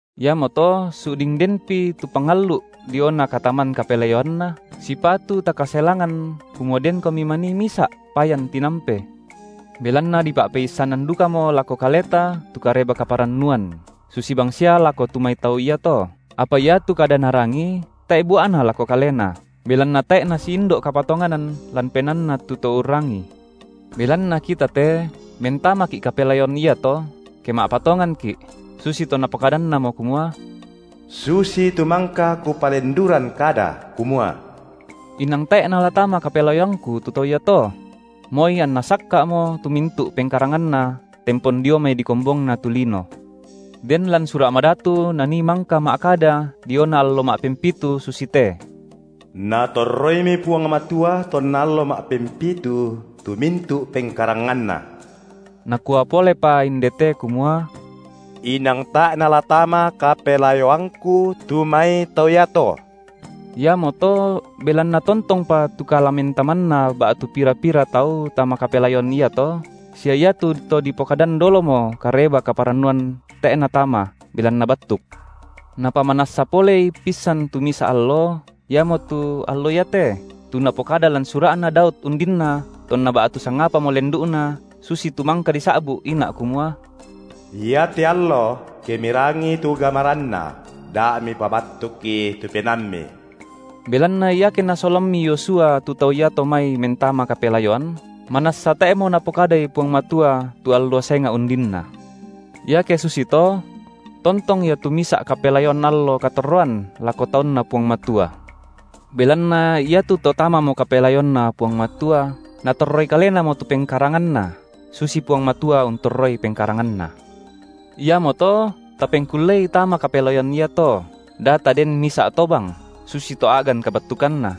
Iamoto su’ding denpi tu pangallu’ diona kataman kapelayoanNa, sipatu takaselangan kumua denkomi manii misa’ payan tinampe. Belanna dipa’peissanan dukamo lako kaleta tu Kareba kaparannuan, susi bangsia lako tu mai tau iato, apa iatu kada narangi tae’ bua’na lako kalena, belanna tae’ nasiindo’ kapatonganan lan penaanna tu to urrangii. Belanna kita te mentamaki’ kapelayoan iato, ke ma’patonganki’, susitu Napokadannamo kumua: Susitu mangka Kupalenduran kada kumua: Inang tae’ nala tama kapelayoangKu tu tau iato; moi anna sakka’mo tu mintu’ pengkaranganna tempon dio mai dikombongna tu lino. Den lan Sura’ Madatu nanii mangka ma’kada diona allo ma’pempitu susite: Natorroimi Puang Matua tonna allo ma’pempitu tu mintu’ pengkaranganNa. Nakua polepa inde te kumua: Inang tae’ nala tama kapelayoangKu tu mai tau iato. Iamoto belanna tongtongpa tu kalamentamanna ba’tu pira-pira tau tama kapelayoan iato, sia iatu to dipokadan dolomo Kareba kaparannuan tae’ natama, belanna battuk. Napamanassa polei pissan tu misa’ allo, iamotu: Allo iate, tu Napokada lan sura’na Daud undinna tonna ba’tu sangapamo lendu’na susitu mangka disa’bu’ ina’ kumua: Iate allo, ke mirangii tu gamaranNa, da mipabattukki tu penaammi. Belanna iake nasolammi Yosua tu tau iato mai mentama kapelayoan, manassa tae’mo Napokadai Puang Matua tu allo senga’ undinna. Iake susito tontong ia tu misa’ kapelayoan allo katorroan lako taunNa Puang Matua. Belanna iatu to tamamo kapelayoanNa Puang Matua, natorroi kalenamo tu pengkaranganna, susi Puang Matua untorroi pengkaranganNa. Iamoto tapengkullei tama kapelayoan iato, da taden misa’ tobang, susi to a’gan kabattukanna.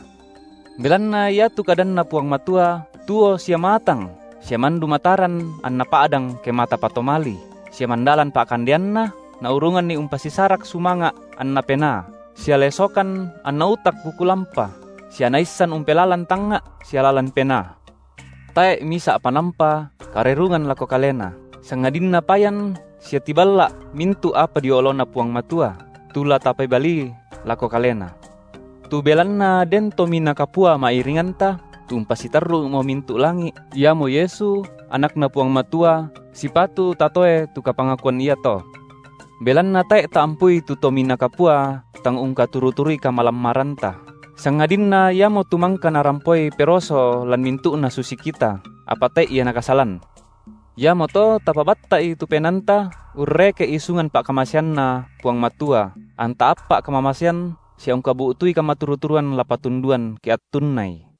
Belanna iatu kadanNa Puang Matua tuo sia maatang sia mandu mataran anna pa’dang kemata patomali, sia mandalan pa’kandeanna, naurunganni umpasisarak sumanga’ anna penaa, sia lesokan anna utak buku lampa, sia naissan umpelalan tangnga’ sia lalan penaa. Tae’ misa’ panampa karerungan lako Kalena, sangadinna payan sia tiballa’ mintu’ apa dio oloNa Puang Matua, tu la tapebalii lako Kalena. Tu belanna den Tominaa Kapua ma’iringanta, tu umpasitarru’mo mintu’ langi’, Iamo Yesu, AnakNa Puang Matua, sipatu tatoe tu kapangakuan iato. Belanna tae’ taampui tu Tominaa Kapua tang ungkaturu-turui kamalammaranta, sangadinna Iamotu mangka narampoi peroso lan mintu’na susi kita, apa tae’ Ia Nakasalan. Iamoto tapabatta’i tu penaanta urreke’ isungan pa’kamaseanNa Puang Matua anta appa’ kamamasean sia ungkabu’tui kamaturu-turuan la patunduan ke attunnai.